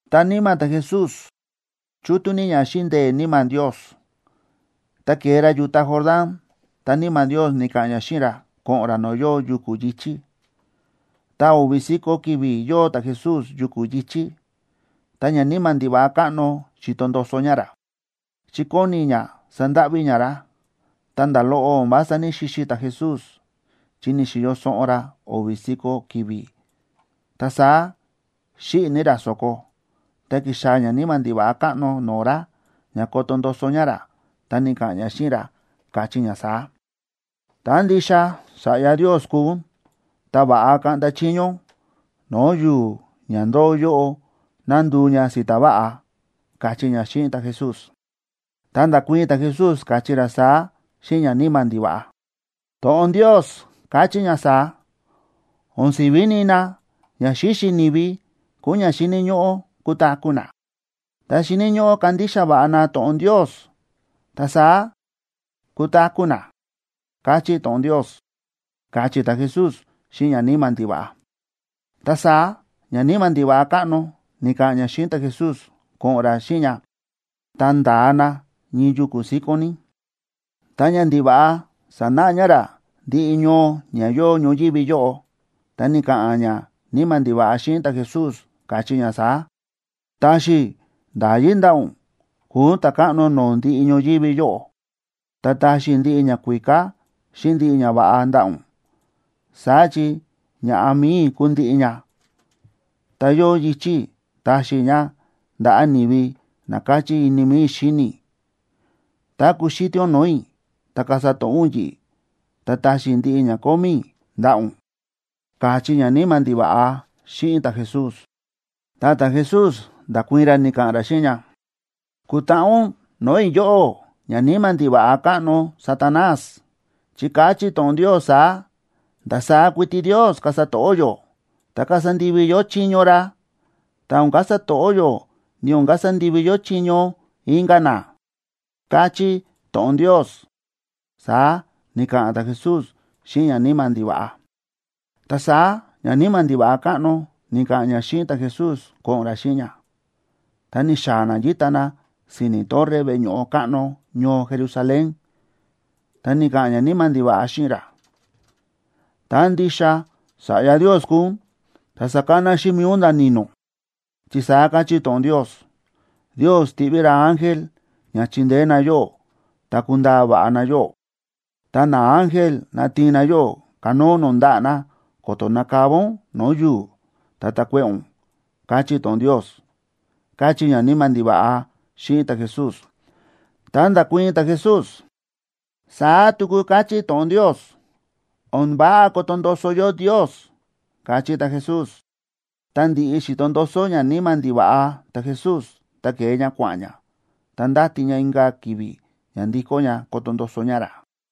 Ta níma̱ ta̱Jesús chútú ní ña xíꞌin ndee̱ Níma̱ Ndios, ta ke̱e ra yu̱ta Jordán, ta Níma̱ Ndios ni̱ka̱ꞌa̱n ña xíꞌin ra ko̱ꞌo̱n ra no̱o̱ yóo yuku̱ yi̱chí. Ta o̱vi̱ si̱ko̱ ki̱vi̱ yóo ta̱Jesús yuku̱ yi̱chí, ta ñaníma̱ ndiva̱ꞌa káꞌno xíto ndoso ña ra, chi kóni ña sandáꞌví ña ra. Ta nda̱ loꞌo o̱n vása ní‑xixi ta̱Jesús, chi ni̱xi̱yo soꞌon ra o̱vi̱ si̱ko̱ ki̱vi̱, ta saá xíꞌi̱ ní ra so̱ko. Ta ki̱xaa̱ ñaníma̱ ndiva̱ꞌa káꞌno no̱o̱ ra ña koto ndoso ña ra, ta ni̱ka̱ꞌa̱n ña xíꞌin ra, káchí ña saá: ―Tá ndixa Sa̱ꞌya Ndios kúu ún, ta va̱ꞌa kaꞌnda chiño ún no̱o̱ yu̱u̱ ña ndóo yóꞌo ná nduu ña si̱ta̱ váꞌa ―káchí ña xíꞌin ta̱Jesús. Ta nda̱kuii̱n ta̱Jesús, káchí ra saá xíꞌin ñaníma̱ ndiva̱ꞌa: ―To̱ꞌon Ndios káchí ña saá: “O̱n si̱ví nina ña xíxi ni̱vi kúu ña xíni̱ ñóꞌó kutaku̱ na. Ta xíni̱ ñóꞌó kandixa va̱ꞌa na to̱ꞌon Ndios, ta saá kutaku̱ na”, káchí to̱ꞌon Ndios ―káchí ta̱Jesús xíꞌin ñaníma̱ ndiva̱ꞌa. Ta saá ñaníma̱ ndiva̱ꞌa káꞌno ni̱ka̱ꞌa̱n ña xíꞌin ta̱Jesús ko̱ꞌo̱n ra xíꞌin ña, ta nda̱a na ñii yuku̱ síkón ní, ta ñandiva̱ꞌa sa̱náꞌa ña ra ndiꞌi ñoo ña yóo ñoyívi yóꞌo, ta ni̱ka̱ꞌa̱n ñaníma̱ ndiva̱ꞌa xíꞌin ta̱Jesús, káchí ña saá: ―Taxi i̱ nda̱yí ndaꞌa̱ ún kuu ún ta̱káꞌno no̱o̱ ndiꞌi ñoyívi yóꞌo, ta taxi i̱ ndiꞌi ñakuíká xíꞌin ndiꞌi ñava̱ꞌa ndaꞌa̱ ún. Saá chi ña̱ꞌa mi̱i i̱ kúu ndiꞌi ña, ta yóo yichi̱ i̱ taxi i̱ ña ndaꞌa̱ ni̱vi na káchí ini mi̱i i̱ xíni i̱. Tá kuxítí ún no̱o̱ i̱, ta kasa to̱ꞌó ún yi̱ꞌi̱, ta taxi i̱ ndiꞌi ña kómí i̱ ndaꞌa̱ ún ―káchí ñaníma̱ ndiva̱ꞌa xíꞌin ta̱Jesús. Ta ta̱Jesús nda̱kuii̱n ra, ni̱ka̱ꞌa̱n ra xíꞌin ña: ―¡Kutaꞌa ún no̱o̱ i̱, yóꞌó, ñaníma̱ ndiva̱ꞌa káꞌno Satanás! Chi káchí to̱ꞌon Ndios saá: “Ndasaá kuiti Ndios kasa to̱ꞌó yó, ta kasa ndivi yó chiño ra, ta o̱n kasa to̱ꞌó yó, ni o̱n kasa ndivi yó chiño inka̱ na”, káchí to̱ꞌon Ndios ―saá ni̱ka̱ꞌa̱n ta̱Jesús xíꞌin ñaníma̱ ndiva̱ꞌa. Ta saá ñaníma̱ ndiva̱ꞌa káꞌno ni̱ka̱ꞌa̱n ña xíꞌin ta̱Jesús ko̱ꞌo̱n ra xíꞌin ña, ta ni̱xaa̱ na yíta na si̱ni̱ torre veꞌe ño̱ꞌo káꞌno ñoo Jerusalén, ta ni̱ka̱ꞌa̱n ñaníma̱ ndiva̱ꞌa xíꞌin ra: ―Tá ndixa Sa̱ꞌya Ndios kúu ún, ta sakana xíꞌin mi̱i ún nda̱ ni̱no̱, chi saá káchí to̱ꞌon Ndios: Ndios tiꞌví ra ángel ña chindeé na yóꞌó ta kundaa va̱ꞌa na yóꞌó. Ta naángel natiin na yóꞌó kanóo ún no̱o̱ ndaꞌa̱ na, ko̱to̱ nakava ún no̱o̱ yu̱u̱, ta takuéꞌe̱ ún, káchí to̱ꞌon Ndios ―káchí ñaníma̱ ndiva̱ꞌa xíꞌin ta̱Jesús. Ta nda̱kuii̱n ta̱Jesús: ―Saá tuku káchí to̱ꞌon Ndios: “O̱n váꞌa koto ndoso yó Ndios” ―káchí ta̱Jesús. Ta ndi̱ꞌi xi̱to ndoso ñaníma̱ ndiva̱ꞌa ta̱Jesús, ta ke̱e ña kua̱ꞌa̱n ña, ta ndáti ña inka̱ ki̱vi̱ ña ndikó ña koto ndoso ña ra.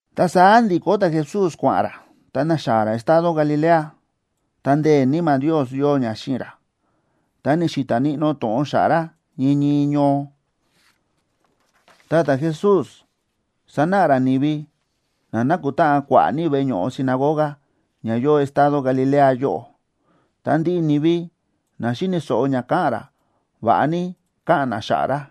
Ta saá ndi̱kó ta̱Jesús kua̱ꞌa̱n ra, ta na̱xaa̱ ra estado Galilea, ta ndee̱ Níma̱ Ndios yóo ña xíꞌin ra. Ta ni̱xi̱ta̱ níꞌnó to̱ꞌon xa̱ꞌa̱ ra ñii ñii ñoo. Ta ta̱Jesús sánáꞌa ra ni̱vi na nákutáꞌan kua̱ꞌa̱ ní veꞌe ño̱ꞌo sinagoga ña yóo estado Galilea yóꞌo. Ta ndiꞌi ni̱vi na xíni̱ so̱ꞌo ña káꞌa̱n ra, va̱ꞌa ní káꞌa̱n na xa̱ꞌa̱ ra.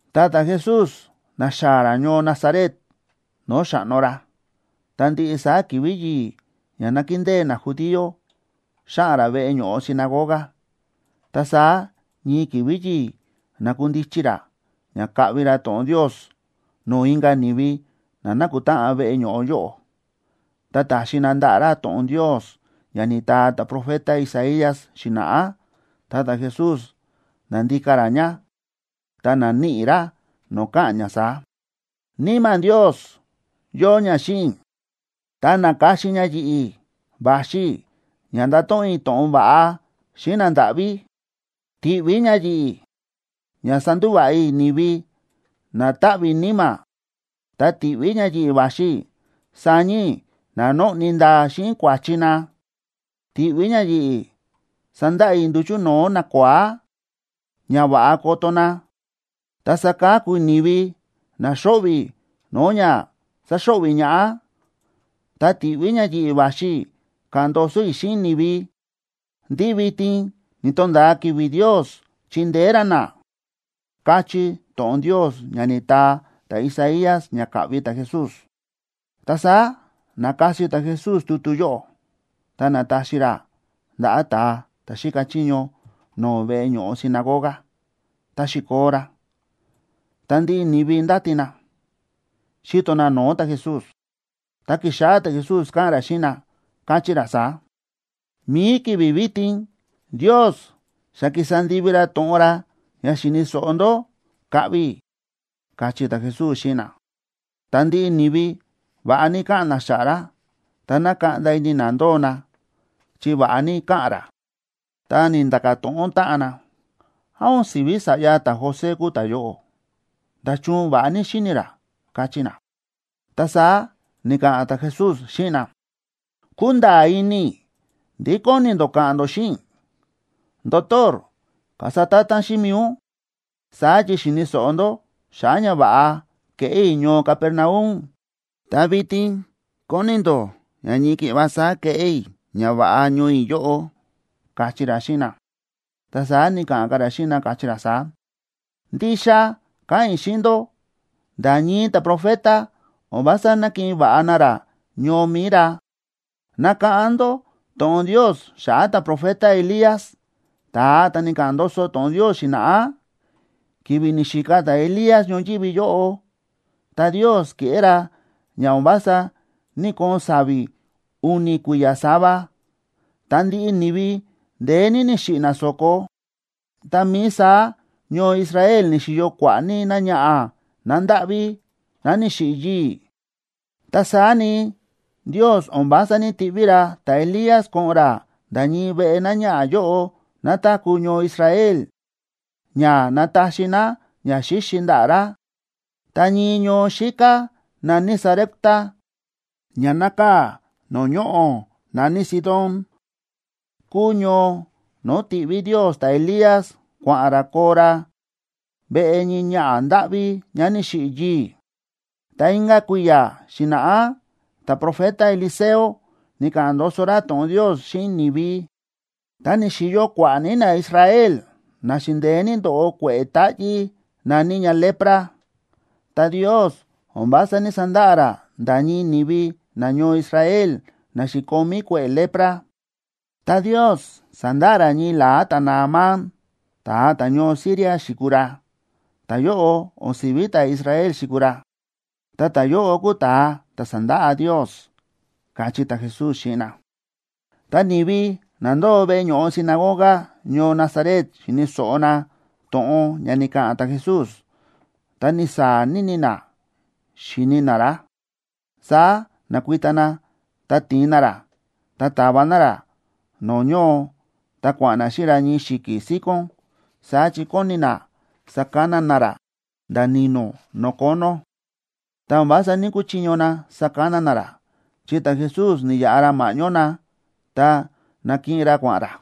Ta ta̱Jesús na̱xaa̱ ra ñoo Nazaret no̱o̱ xa̱ꞌno ra. Ta ndiꞌi saá ki̱vi̱ yi̱i̱ ña nákindée najudío xáꞌa̱n ra veꞌe ño̱ꞌo sinagoga. Ta saá ñii ki̱vi̱ yi̱i̱, na̱kundichi ra ña kaꞌvi ra to̱ꞌon Ndios no̱o̱ inka̱ ni̱vi na na̱kutáꞌan veꞌe ño̱ꞌo yóꞌo. Ta ta̱xi na ndaꞌa̱ ra to̱ꞌon Ndios ña ni̱taa ta̱profeta Isaías xi̱na̱ꞌá. Ta ta̱Jesús na̱ndika ra ña, ta na̱níꞌi ra no̱o̱ káꞌa̱n ña saá: Níma̱ Ndios yóo ña xíꞌin i̱, ta na̱ka̱xin ña yi̱ꞌi̱ va̱xi i̱ ña ndato̱ꞌon i̱ to̱ꞌon va̱ꞌa xíꞌin nandáꞌví. Ti̱ꞌví ña yi̱ꞌi̱ ña sandúva̱ꞌa i̱ ni̱vi na táꞌví níma̱. Ta ti̱ꞌví ña yi̱ꞌi̱ va̱xi i̱ saña i̱ na nóꞌni ndaa xíꞌin kua̱chi na. Ti̱ꞌví ña yi̱ꞌi̱ sandaꞌa i̱ nduchu̱ no̱o̱ nakua̱á, ña va̱ꞌa koto na, ta saka̱ku i̱ ni̱vi na xóꞌvi̱ no̱o̱ ña sáxo̱ꞌvi̱ ñaꞌá. Ta ti̱ꞌví ña yi̱ꞌi̱ va̱xi i̱ ka̱ꞌa̱n ndoso i̱ xíꞌin ni̱vi ndí vitin ni̱to̱nda̱a ki̱vi̱ Ndios chindeé ra na, káchí to̱ꞌon Ndios ña ni̱taa ta̱Isaías ña ka̱ꞌvi ta̱Jesús. Ta saá na̱kasi ta̱Jesús tutu yóꞌo, ta na̱taxi ra ndaꞌa̱ ta̱a ta̱ xíka chiño no̱o̱ veꞌe ño̱ꞌo sinagoga, ta xi̱koo ra, ta ndiꞌi ni̱vi ndáti na, xíto na no̱o̱ ta̱Jesús. Ta ki̱xáꞌá ta̱Jesús káꞌa̱n ra xíꞌin na, káchí ra saá: ―Mi̱i ki̱vi̱ vitin, Ndios xa ki̱sa ndivi ra to̱ꞌon ra ña xi̱ni̱ so̱ꞌo ndó ka̱ꞌvi i̱ ―káchí ta̱Jesús xíꞌin na. Ta ndiꞌi ni̱vi va̱ꞌa ní káꞌa̱n na xa̱ꞌa̱ ra. Ta na̱kaꞌnda ini na ndóo na, chi va̱ꞌa ní káꞌa̱n ra. Ta ni̱nda̱ka̱ to̱ꞌon táꞌan na: ―¿Án o̱n si̱ví sa̱ꞌya ta̱José kúu ta̱yóꞌo? ¡Nda̱chun va̱ꞌa ní xíni̱ ra! ―káchí na. Ta saá ni̱ka̱ꞌa̱n ta̱Jesús xíꞌin na: ―Kúnda̱a̱ ini i̱ ndí kóni ndó ka̱ꞌa̱n ndó xíꞌin i̱: “Ndotor, kasa ta̱ta̱n xíꞌin mi̱i ún.” Saá chi xi̱ni̱ so̱ꞌo ndó xa̱ꞌa̱ ñava̱ꞌa ke̱ꞌé i̱ ñoo Capernaum, ta vitin kóni ndó ña ñii ki̱ꞌva saá keꞌé i̱ ñava̱ꞌa ñoo i̱ yóꞌo ―káchí ra xíꞌin na. Ta saá ni̱ka̱ꞌa̱n ka̱ ra xíꞌin na, káchí ra saá: ―Ndixa káꞌa̱n i̱ xíꞌin ndó, nda̱ ñii ta̱profeta, o̱n vása nákiꞌin va̱ꞌa na ra ñoo mi̱i ra. Nakáꞌán ndó to̱ꞌon Ndios xa̱ꞌa̱ ta̱profeta Elías, ta̱a ta̱ ni̱ka̱ꞌa̱n ndoso to̱ꞌon Ndios xi̱na̱ꞌá. Ki̱vi̱ ni̱xika ta̱Elías ñoyívi yóꞌo, ta Ndios ke̱ꞌé ra ña o̱n vása ní‑koon sa̱vi̱ u̱ni̱ kui̱ya̱ sava, ta ndiꞌi ni̱vi ndeé ní ni̱xiꞌi̱ na so̱ko. Tá mií saá ñoo Israel ni̱xi̱yo kua̱ꞌa̱ ní náñaꞌa̱ ná ndáꞌví, ná ni̱xiꞌi̱ yii̱. Ta saá ni, Ndios o̱n vása ní‑tiꞌví ra ta̱Elías ko̱ꞌo̱n ra nda̱ ñii veꞌe náñaꞌa̱ yóꞌo ná táku̱ ñoo Israel ña nataxi ná ñaxíxi ndaꞌa̱ ra. Ta ñii ñoo xíká na̱ní Sarepta, ña nákaa̱ no̱o̱ ñoꞌo̱ na̱ní Sidón, kúu ñoo no̱o̱ ti̱ꞌví Ndios ta̱Elías kua̱ꞌa̱n ra koo ra veꞌe ñii ñaꞌa̱ ndáꞌví ñá ni̱xiꞌi̱ yii̱. Ta inka̱ kui̱ya̱ xi̱na̱ꞌá ta̱profeta Eliseo ni̱ka̱ꞌa̱n ndoso ra to̱ꞌon Ndios xíꞌin ni̱vi, ta ni̱xi̱yo kua̱ꞌa̱ ní naIsrael na xi̱ndeé ní ndóꞌo kue̱ꞌe̱ táꞌyí na̱ní ña lepra. Ta Ndios o̱n vása ní‑sandaꞌa ra nda̱ ñii ni̱vi nañoo Israel na xi̱komí kue̱ꞌe̱ lepra, ta Ndios sa̱ndaꞌa ra ñii la̱á ta̱Naamán, ta̱a ta̱ñoo Siria xi̱kuu ra. Ta̱yóꞌo o̱n si̱ví ta̱Israel xi̱kuu ra, ta ta̱yóꞌo kúu ta̱a ta̱ sa̱ndaꞌa Ndios ―káchí ta̱Jesús xíꞌin na. Tá ni̱vi na ndóo veꞌe ño̱ꞌo sinagoga ñoo Nazaret xíni̱ so̱ꞌo na to̱ꞌon ña ni̱ka̱ꞌa̱n ta̱Jesús, ta ni̱saa̱ ní na xíni na ra. Saá na̱kuita na, ta ti̱in na ra, ta ta̱va na ra no̱o̱ ñoo, ta kua̱ꞌa̱n na xíꞌin ra ñii xi̱ki̱ síkón. Saá chi kóni na sakana na ra nda̱ ni̱no̱ no̱o̱ kónó. Ta o̱n vása ní‑kuchiño na sakana na ra, chi ta̱Jesús ni̱yaꞌa ra ma̱ꞌñó na, ta na̱kiꞌin ra kua̱ꞌa̱n ra.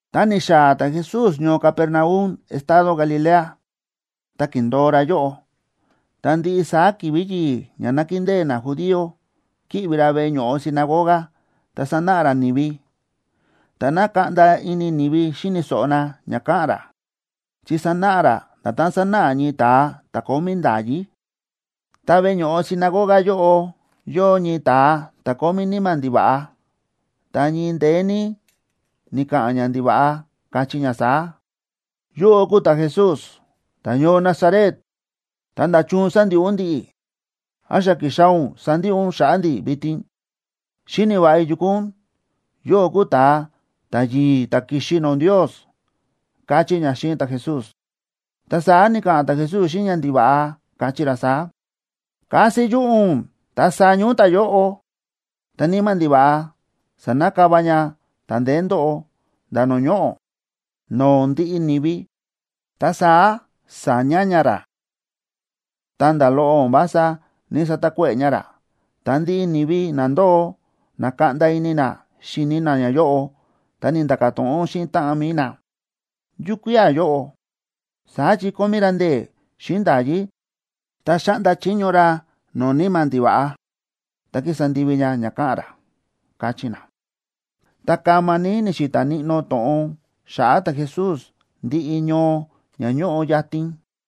Ta ni̱xaa̱ ta̱Jesús ñoo Capernaum estado Galilea, ta ki̱ndo̱o ra yóꞌo. Ta ndiꞌi saá ki̱vi̱ yi̱i̱ ña nákindée najudío, kíꞌvi ra veꞌe ño̱ꞌo sinagoga, ta sánáꞌa ra ni̱vi. Ta na̱kaꞌnda ini ni̱vi xíni̱ so̱ꞌo na ña káꞌa̱n ra, chi sánáꞌa ra na nda̱tán sánáꞌa ñii ta̱a ta̱ kómí nda̱yí. Ta veꞌe ño̱ꞌo sinagoga yóꞌo yóo ñii ta̱a ta̱ kómí níma̱ ndiva̱ꞌa, ta ñii ndeé ní ni̱ka̱ꞌa̱n ñandiva̱ꞌa, káchí ña saá: ―Yóꞌó kúu ta̱Jesús ta̱ñoo Nazaret, ta, ¿nda̱chun sándiꞌi ún ndi̱ꞌi̱? ¿Án xa ki̱xaa̱ ún sandiꞌi ún xa̱ꞌa̱ ndi̱ vitin? Xíni̱ va̱ꞌa i̱ yu kúu ún, yóꞌó kúu ta̱a ta̱yi̱i̱ ta̱ ki̱xi no̱o̱ Ndios ―káchí ña xíꞌin ta̱Jesús. Ta saá ni̱ka̱ꞌa̱n ta̱Jesús xíꞌin ñandiva̱ꞌa, káchí ra saá: ―¡Kasi yuꞌu̱ ún ta saña ún ta̱yóꞌo! Ta níma̱ ndiva̱ꞌa sa̱nakava ña ta̱ ndeé ndóꞌo nda̱ no̱o̱ ñoꞌo̱, no̱o̱ ndiꞌi ni̱vi. Ta saá sa̱ña ña ra, ta nda̱ loꞌo o̱n vása ní‑satakuéꞌe̱ ña ra. Ta ndiꞌi ni̱vi na ndóo, na̱kaꞌnda ini na xíni na ñayóꞌo, ta ni̱nda̱ka̱ to̱ꞌon xíꞌin táꞌan mi̱i na: ―¿Yukía̱ yóꞌo? ¡Saá chi kómí ra ndee̱ xíꞌin nda̱yí, ta xáꞌnda chiño ra no̱o̱ níma̱ ndiva̱ꞌa, ta kísa ndivi ña ña káꞌa̱n ra! ―káchí na. Ta kama ní ni̱xi̱ta̱ níꞌnó to̱ꞌon xa̱ꞌa̱ ta̱Jesús ndiꞌi ñoo ña ñóꞌo yatin.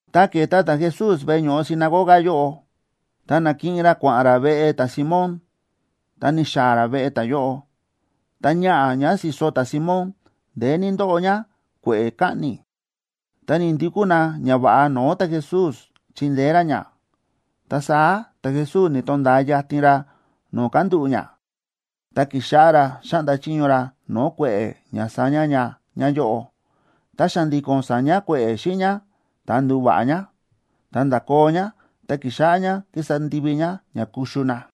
Ta ke̱e ta̱Jesús veꞌe ño̱ꞌo sinagoga yóꞌo, ta na̱kiꞌin ra kua̱ꞌa̱n ra veꞌe ta̱Simóna ta ni̱xaa̱ ra veꞌe ta̱yóꞌo. Ta ñaꞌa̱ ñá si̱so ta̱Simón ndeé ní ndóꞌo ñá kue̱ꞌe̱ kaꞌni̱. Ta ni̱ndukú na ñava̱ꞌa no̱o̱ ta̱Jesús chindeé ra ñá. Ta saá ta̱Jesús ni̱to̱nda̱a yatin ra no̱o̱ kándúꞌu̱ ñá, ta kíxáꞌá ra xáꞌnda chiño ra no̱o̱ kue̱ꞌe̱ ña saña ña ñáyóꞌo. Ta xa̱ndi̱ko̱n sa̱ña kue̱ꞌe̱ xíꞌin ñá, ta ndu̱va̱ꞌa ñá. Ta nda̱koo ñá, ta ki̱xáꞌá ñá kísa ndivi ñá ña kuxu na.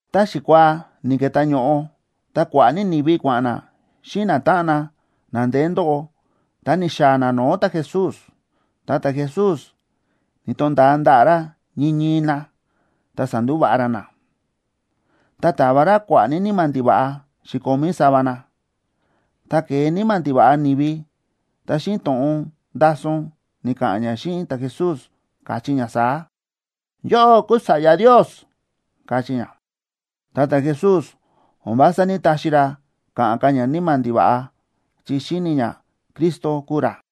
Tá xikuaa ni̱ke̱tá ño̱ꞌo, ta kua̱ꞌa̱ ní ni̱vi kua̱ꞌa̱n na xíꞌin natáꞌan na, na ndeé ndóꞌo, ta ni̱xaa̱ na no̱o̱ ta̱Jesús. Ta ta̱Jesús ni̱to̱nda̱a ndaꞌa̱ ra ñii ñii na, ta sa̱ndúva̱ꞌa ra na. Ta ta̱va ra kua̱ꞌa̱ ní níma̱ ndiva̱ꞌa xi̱komí sava na. Tá ke̱e níma̱ ndiva̱ꞌa ni̱vi, ta xíꞌin to̱ꞌon ndason ni̱ka̱ꞌa̱n ña xíꞌin ta̱Jesús, káchí ña saá: ―Yóꞌó kúu Sa̱ꞌya Ndios ―káchí ña. Ta ta̱Jesús o̱n vása ní‑taxi ra ka̱ꞌa̱n ka̱ ñaníma̱ ndiva̱ꞌa, chi xíni̱ ña Cristo kúu ra.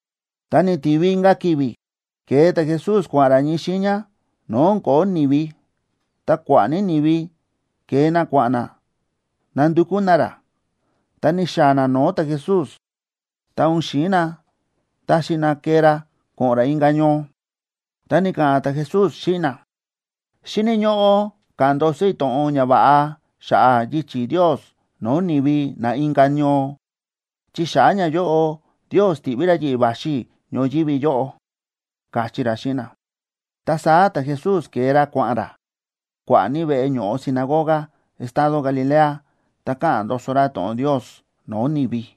Tá ni̱tivi inka̱ ki̱vi̱, ke̱e ta̱Jesús kua̱ꞌa̱n ra ñii xiiña no̱o̱ o̱n ko̱ó ni̱vi. Ta kua̱ꞌa̱ ní ni̱vi ke̱e na kua̱ꞌa̱n na nandukú na ra. Ta ni̱xaa̱ na no̱o̱ ta̱Jesús, ta o̱n xi̱in na taxi na kee ra ko̱ꞌo̱n ra inka̱ ñoo. Ta ni̱ka̱ꞌa̱n ta̱Jesús xíꞌin na: ―Xíni̱ ñóꞌó ka̱ꞌa̱n ndoso i̱ to̱ꞌon ñava̱ꞌa xa̱ꞌa̱ yichi̱ Ndios no̱o̱ ni̱vi na inka̱ ñoo, chi xa̱ꞌa̱ ñayóꞌo Ndios ti̱ꞌví ra yi̱ꞌi̱ va̱xi i̱ ñoyívi yóꞌo ―káchí ra xíꞌin na. Ta saá ta̱Jesús ke̱e ra kua̱ꞌa̱n ra kua̱ꞌa̱ ní veꞌe ño̱ꞌo sinagoga estado Galilea, ta káꞌa̱n ndoso ra to̱ꞌon Ndios no̱o̱ ni̱vi.